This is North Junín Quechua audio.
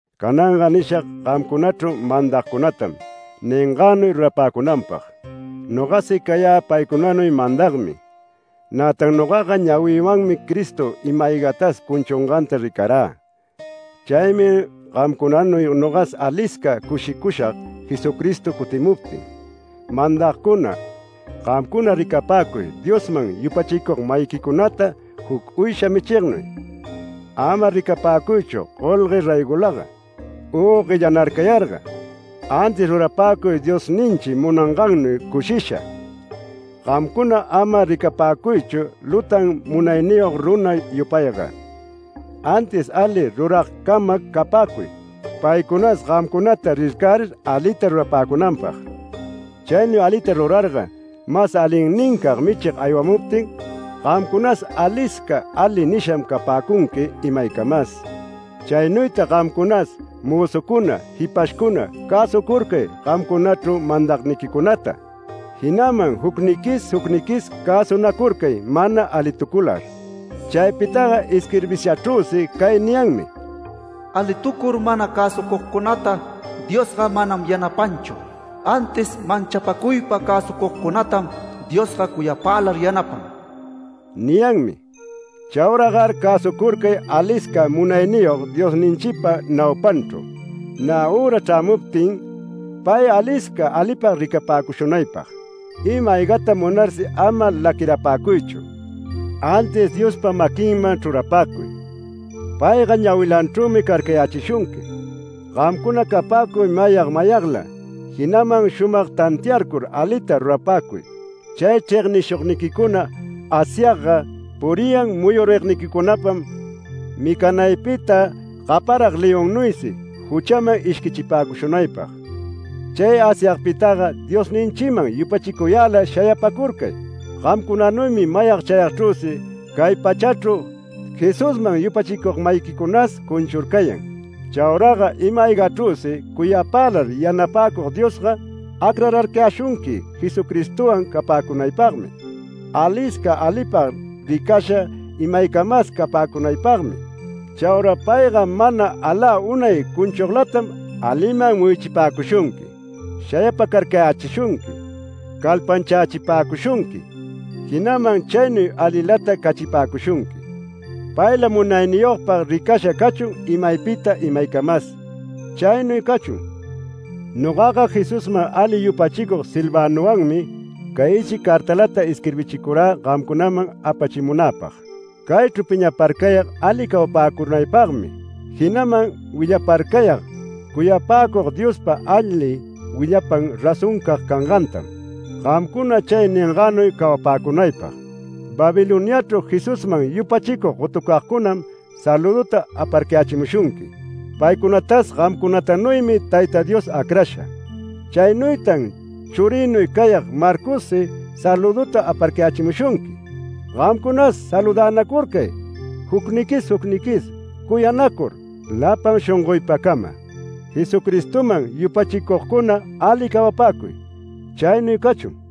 Cananga nishag gamcunachru mandagcunatam ningänuy rurapäcunanpag. Nogasi cayä paycunanuy mandagmi. Nätan nogaga ñawïwanmi Cristo ima-aygatas cunchunganta ricarä. Chaymi gamcunanuy nogas alisca cushicushag Jesucristo cutimuptin. Mandagcuna, gamcuna ricapäcuy Diosman yupachicug-mayiquicunata juc uysha michignuy. Ama ricapäcuychu golgue raygolaga u guellanarcayarga. Antis rurapäcuy Diosninchi munangannuy cushisha. Gamcuna ama ricapäcuychu lutan munayniyog runa yupayga, antis ali ruragcama capäcuy paycunas gamcunata rircärir alita rurapäcunanpag. Chaynuy alita rurarga mas alinnincag Michig aywamuptin, “Gamcunas alisca ali” nisham capäcunqui imaycamas. Chaynuytag gamcunas mözucuna, jipashcuna, cäsucurcay gamcunachru mandagniquicunata, jinaman jucniquis jucniquis cäsunacurcay mana alitucular. Chaypitaga isquirbishachrüsi cay niyanmi: “Alitucur mana cäsucugcunata Diosga manam yanapanchu. Antis manchapäcuypa cäsucugcunatam Diosga cuyapälar yanapan” niyanmi. Chauragar cäsucurcay alisca Munayniyog Diosninchipa naupanchru, nä üra chrämuptin pay alisca alipag ricapäcushunaypag. Ima-aygata munarsi ama laquirapäcuychu. Antis Diospa maquinman chrurapäcuy. Payga ñawilanchrümi carcayächishunqui. Gamcuna capäcuy mayag mayagla, jinaman shumag tantiarcur alita rurapäcuy. Chay chregnishugniquicuna Asyagga puriyan muyurigniquicunapam micanaypita gaparag leonnuysi juchäman ishquichipäcushunaypag. Chay Asyagpitaga Diosninchiman yupachicuyälar shayapacurcay. Gamcunanuymi mayag chayagchrüsi cay pachachru Jesusman yupachicug-mayiquicunas cunchurcayan. Chauraga ima-aygachrüsi cuyapälar yanapäcug Diosga, acrarcayäshunqui Jesucristowan capäcungaypagmi, alisca alipag ricasha imaycamas capäcunaypagmi. Chaura payga mana alä unay cunchuglatam aliman muyuchipäcushunqui, shayapacarcayächishunqui, calpanchächipäcushunqui, jinaman chaynuy alilata cachipäcushunqui. Payla munayniyogpag ricasha cachun imaypita imaycamas. Chaynuy cachun. Nogaga Jesusman ali yupachicug Silvanowanmi cay ichic cartalata isquirbichicurä gamcunaman apachimunäpag. Caychru piñaparcayag ali cawapäcunaypagmi, jinaman willaparcayag cuyapäcug Diospa ali willapan razoncag cangantam, gamcuna chay ningänuy cawapäcunaypag. Babiloniachru Jesusman yupachicug gotucagcunam salüduta aparcayächimushunqui. Paycunatas gamcunatanuymi Tayta Diosga acrasha. Chaynuytan churïnuy cayag Marcossi salüduta aparcayächimushunqui. Gamcunas saludänacurcay jucniquis jucniquis, cuyanacur lapan shongoypacama. Jesucristoman yupachicugcuna ali cawapäcuy. Chaynuy cachun.